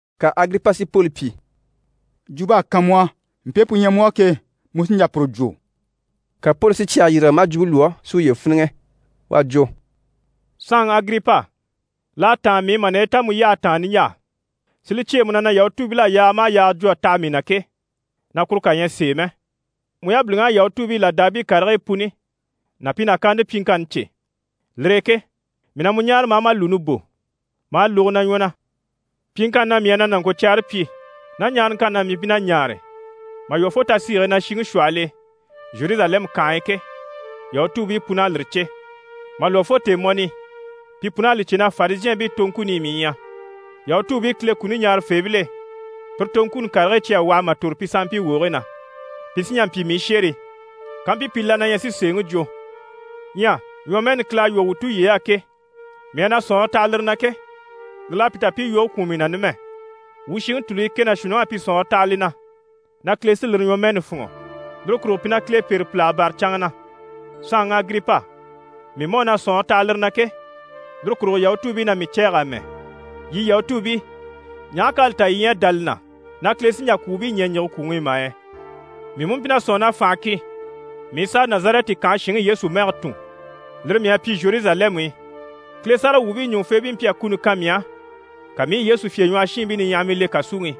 Ka Agiripa si Poli pyi: «Jwump'à kan mu á, mpe pu ɲyɛ mu á ke, mu sí n‑jà puru jwo.» Ka Poli si cyɛge yîrige maa jwumpe lwɔ́ si uye fíniŋɛ. U à jwo: «Saanŋi Agiripa, l'à táan mii i mà naye ta mu yyahe taan niɲjaa, si li cyêe mu na na Yahutuubil'à yaaga maha yaaga jwo a taha mii na ke, na kuru kà ɲyɛ sèe mɛ. Mu yabiliŋ'à Yahutuubii làdaabii karigii puni ná pi nàkaante pyiŋkanni cè. Lire e ke mii na mu ɲáare ma a ma lùuni bò, ma a lógo na ɲwɔ na. Pyiŋkanni na mii à na nàŋkocyɛɛre pyi, ná ɲaaraŋkanni na mii mpyi na ɲaare mà lwɔ́ fo tasiige e na shiŋi shwɔhɔl'e Zheruzalɛmu kànhe e ke, Yahutuubii pun'à lire cè. Mà lwɔ́ fo tèemɔni i, pi pun'à li cè na Farizhɛɛnbii toŋkuni i mii ɲyɛ, Yahutuubii Kile kuni ɲaarafeebil'e, pire toŋkuni karigii cyi à waha mà tòro pi sanmpii wogigii na. Pi sí n‑jà n‑pyi mii shérii, kampyi pi la na ɲyɛ si sèeŋi jwo. Ɲyɛ ɲwɔmɛɛni Kile à lwɔ́ wuu tulyey'á ke, mii à na sɔ̀nŋɔre taha lire na ke, lire l'à pi ta pi i yoge kwùun mii na numɛ. Wuu shiŋi tùluyi kɛ ná shuunniŋ'à pi sɔ̀nŋɔre taha li na na Kile sí lire ɲwɔmɛɛni fûnŋɔ, lire kurugo pi na Kile pêre pìlaga bâra canŋa na. Saanŋi Agiripa, mii mú à na sɔ̀nŋɔre taha lire na ke, lire kurugo Yahutuubii na mii cɛ̂ɛge amɛ! Yii Yahutuubii, ɲaha k'à li ta yii ɲyɛ a dá li na na Kile sí n‑jà kwùubii ɲɛ̀ n‑yige kwùŋi i mà yɛ? Mii mú mpyi na sɔ̂nŋi na fànha ki, mii i sàa Nazarɛti kànhe shinŋi Yesu mɛge tùn. Lire mii à pyi Zheruzalɛmu i. Kile sáragawwuubii ɲùŋufeebii mpyi a kuni kan mii á, ka mii i Yesu fyèɲwɔhɔshiinbii niɲyahamii le kàsuŋi i.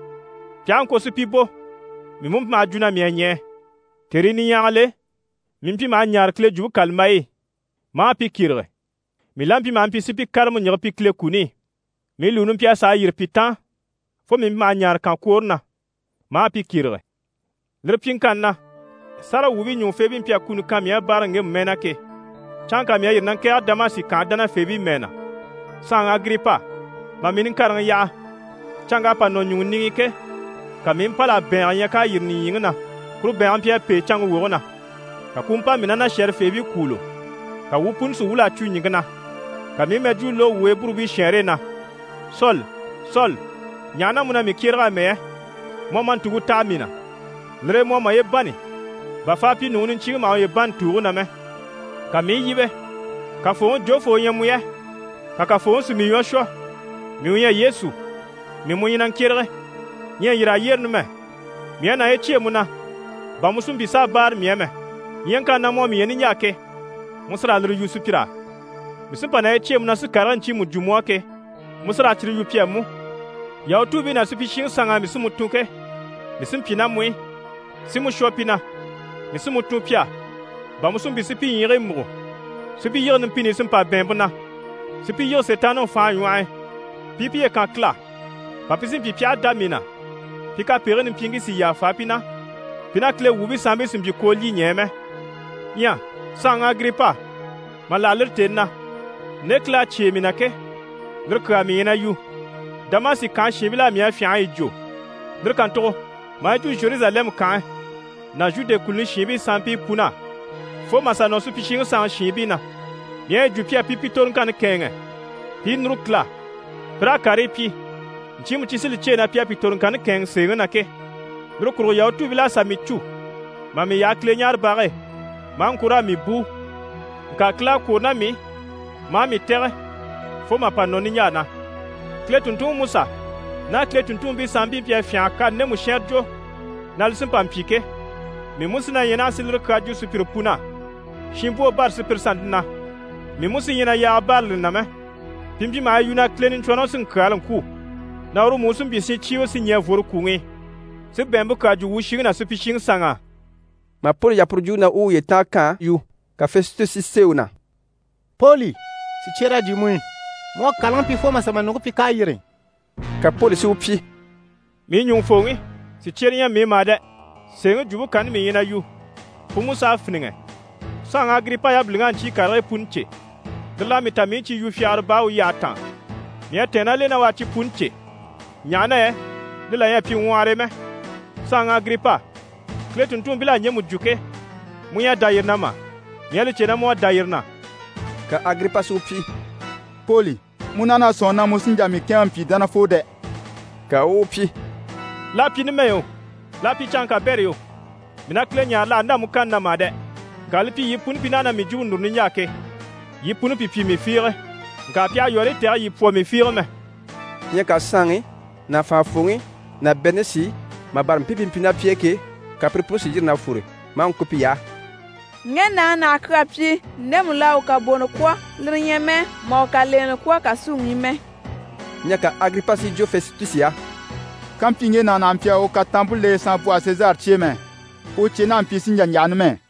Pi aha ŋko si pi bò, mii mú mpyi maha jwo na mii à ɲɛɛ. Tèrii niɲyahagil'e, mii mpyi maha ɲaare Kile Jwumpe kàlambayi i, maa pi kyérege. Mii la mpyi maha mpyi si pi kárama ɲjige pi Kile kuni i. Mii lùuni mpyi a sàa yîri pi taan fo mii mpyi maha ɲaare kànkwoore na, maa pi kyérege. Lire pyiŋkanni na, sáragawwuubii ɲùŋufeebii mpyi a kuni kan mii á báaraŋi ŋgemu mɛɛ na ke, canŋka mii à yîri na ŋkɛ̀ɛge Damasi kànhe dánafeebii mɛɛ na. Saanŋi Agiripa, mà mii niŋkareŋi yaha, canŋk'à pa nɔ ɲùŋɔ niŋi i ke, ka mii i mpâl'a bɛ̀ɛngɛ ɲya k'à yîri nìɲyiŋi na. Kuru bɛ̀ɛnge mpyi a pêe canŋke woge na, ka ku u mpa mii ná na shɛ̀rɛfeebii kwûulo. Ka wuu puni si wwûl'a cwo ɲìŋke na. Ka mii i mɛjwuu lógo wuu Eburubii shɛɛnre e na “Soli, Soli, ɲaha na mu na mii kyérege amɛ yɛ? Mu à ma ntùŋke taha mii na, lire e mu à maye bânni bà faapyinuŋi niɲcyiŋi maha uye bânni tùuge na mɛ.” Ka mii i yíbe “Kafooŋi, jofoo u ɲyɛ mu yɛ?” Ka Kafooŋi si mii ɲwɔ shwɔ “Mii u ɲyɛ Yesu, mii mu ɲyɛ na ŋkyérege. Ɲyɛ yîr'a yyére numɛ. Mii à naye cyêe mu na bà mu si mpyi s'a báare mii á mɛ. Ɲyaŋkanni na mu à mii ɲya niɲjaa ke, mu sí raa lire yu sùpyir'á. Mii sí n‑pa naye cyêe mu na si karigii ɲcyiimu jwo mu á ke, mu sí raa cyire yu pi á mú. Yahutuubii ná supyishiŋi sanŋ'á mii sí mu tun ke, mii sí n‑pyi ná mu i, si mu shwɔ pi na. Mii sí mu tun pi á, bà mu si mpyi si pi ɲyiigii múgo, si pi yige numpini i si mpa bɛ̀ɛnmpe na, si pi yige Sitaanniŋi fànhe ɲwɔh'i, pi i piye kan Kile á, bà pi si mpyi pi aha dá mii na, pi kapegigii nimpyiiŋkii si yàfa pi na, pi ná Kile wuubii sanmpii si mpyi koolyiɲɛɛ mɛ.” Ɲyɛ saanŋi Agiripa, mà láha lire tèni na, nde Kile à cyêe mii na ke, lire kyaa mii ɲyɛ na yu. Damasi kànhe shiinbil'á mii à fyânha a yi jwo, lire kàntugo maa yi jwo Zheruzalɛmu kànhe ná Zhude kùluni shiinbii sanmpii pun'á fo mà sà nɔ supyishiŋi sanŋi shiinbii na. Mii à yi jwo pi á pi pi toroŋkanni kɛ̂ɛnŋɛ, pi i núru Kile á, pi raa karii pyi ɲcyiimu cyi sí li cyêe na pi à pi toroŋkanni kɛ̂ɛnŋɛ sèeŋi na ke. Lire kurugo Yahutuubil'à sà mii cû mà mii yaha Kileɲaarebage e, maa ŋko raa mii bùu. Ŋka Kile à kwôro ná mii i, maa mii tɛ̀gɛ fo mà pa nɔ niɲjaa na. Kile tùnntunŋi Musa ná Kile tùnntunmpii sanmpii mpyi a fyânha a kani ndemu shɛnrɛ jwo na li sí n‑pa n‑pyi ke, mii mú sí na ɲyɛ naha si lire kyaa jwo sùpyire pun'á, shinbwoo bâra sùpyire sannte na. Mii mú sí ɲyɛ na yaaga bârali lire na mɛ. Pi mpyi maha yi yu na Kile Niɲcwɔnrɔŋi sí n‑kyaala n‑kwû, na uru mú u sí n‑pyi shincyiiwe si ɲɛ̀ vworo kwùŋi i, si bɛ̀ɛnmpe kyaa jwo wuu shiŋi ná supyishiŋi sanŋ'á.» Mà Poli yaha puru jwumpe na u u uye tànga yu, ka Fɛsitusi si sêe u na: «Poli, sìcyer'à jyè mu i! Mu à kàlaŋi pyi fo mà sà ma ɲùŋke pyi k'à yîri!» Ka Poli si u pyi: «Mii ɲùŋufooŋi, sìcyere ɲyɛ mii i mà dɛ! Sèeŋi jwumpe kanni mii ɲyɛ na yu, pu mú s'à fíniŋɛ. Saanŋi Agiripa yabiliŋ'à ɲcyii karigii puni cè, lire l'à mii ta mii i cyi yu fyagara baa u yyahe taan. Mii à tɛ̀ɛn ná l'e na u à cyi puni cè, ɲaha na yɛ li là ɲyɛ a pyi ŋwɔhɔre e mɛ. Saanŋi Agiripa, Kile tùnntunmpil'à ɲjemu jwo ke, mu ɲyɛ a dá yire na mà? Mii à li cè na mu à dá yire na.» Ka Agiripa si u pyi: «Poli, mu naha na sɔ̂nŋi na mu sí n‑jà mii kɛ̂ɛnŋɛ mpyi dánafoo dɛ!» Ka u u u pyi: «L'à pyi numɛ yo, l'à pyi canŋke kabɛrɛ yo, mii na Kile ɲáare l'àha ndâ mu kanni na mà dɛ, ŋka li pyi yii puni pi naha na mii jwumpe núru niɲjaa ke, yii puni pi pyi mii fiige, ŋka pi àha yɔ̀rɔyɔ tɛ̀gɛ yii pwɔ mii fiige mɛ.» Ɲyɛ ka saanŋi ná fànhafooŋi ná Berenishi, mà bâra mpii pi mpyi ná pi e ke, ka pire puni si yîri na fwore, maa ŋko piy'á: «Ŋge nàŋi naha a kyaa pyi ndemu l'à u kabonɔ kwɔ̀, lire ɲyɛ mɛ mà u kalenɛ kwɔ̀ kàsuŋi i mɛ.» Ɲyɛ ka Agiripa si yi jwo Fɛsitusi á: «Kàmpyi ŋge nàŋi naha mpyi a u kataanmpe le saanbwɔhe Sezari cye e mɛ, u cye naha a mpyi sí n‑jà n‑yaha numɛ.»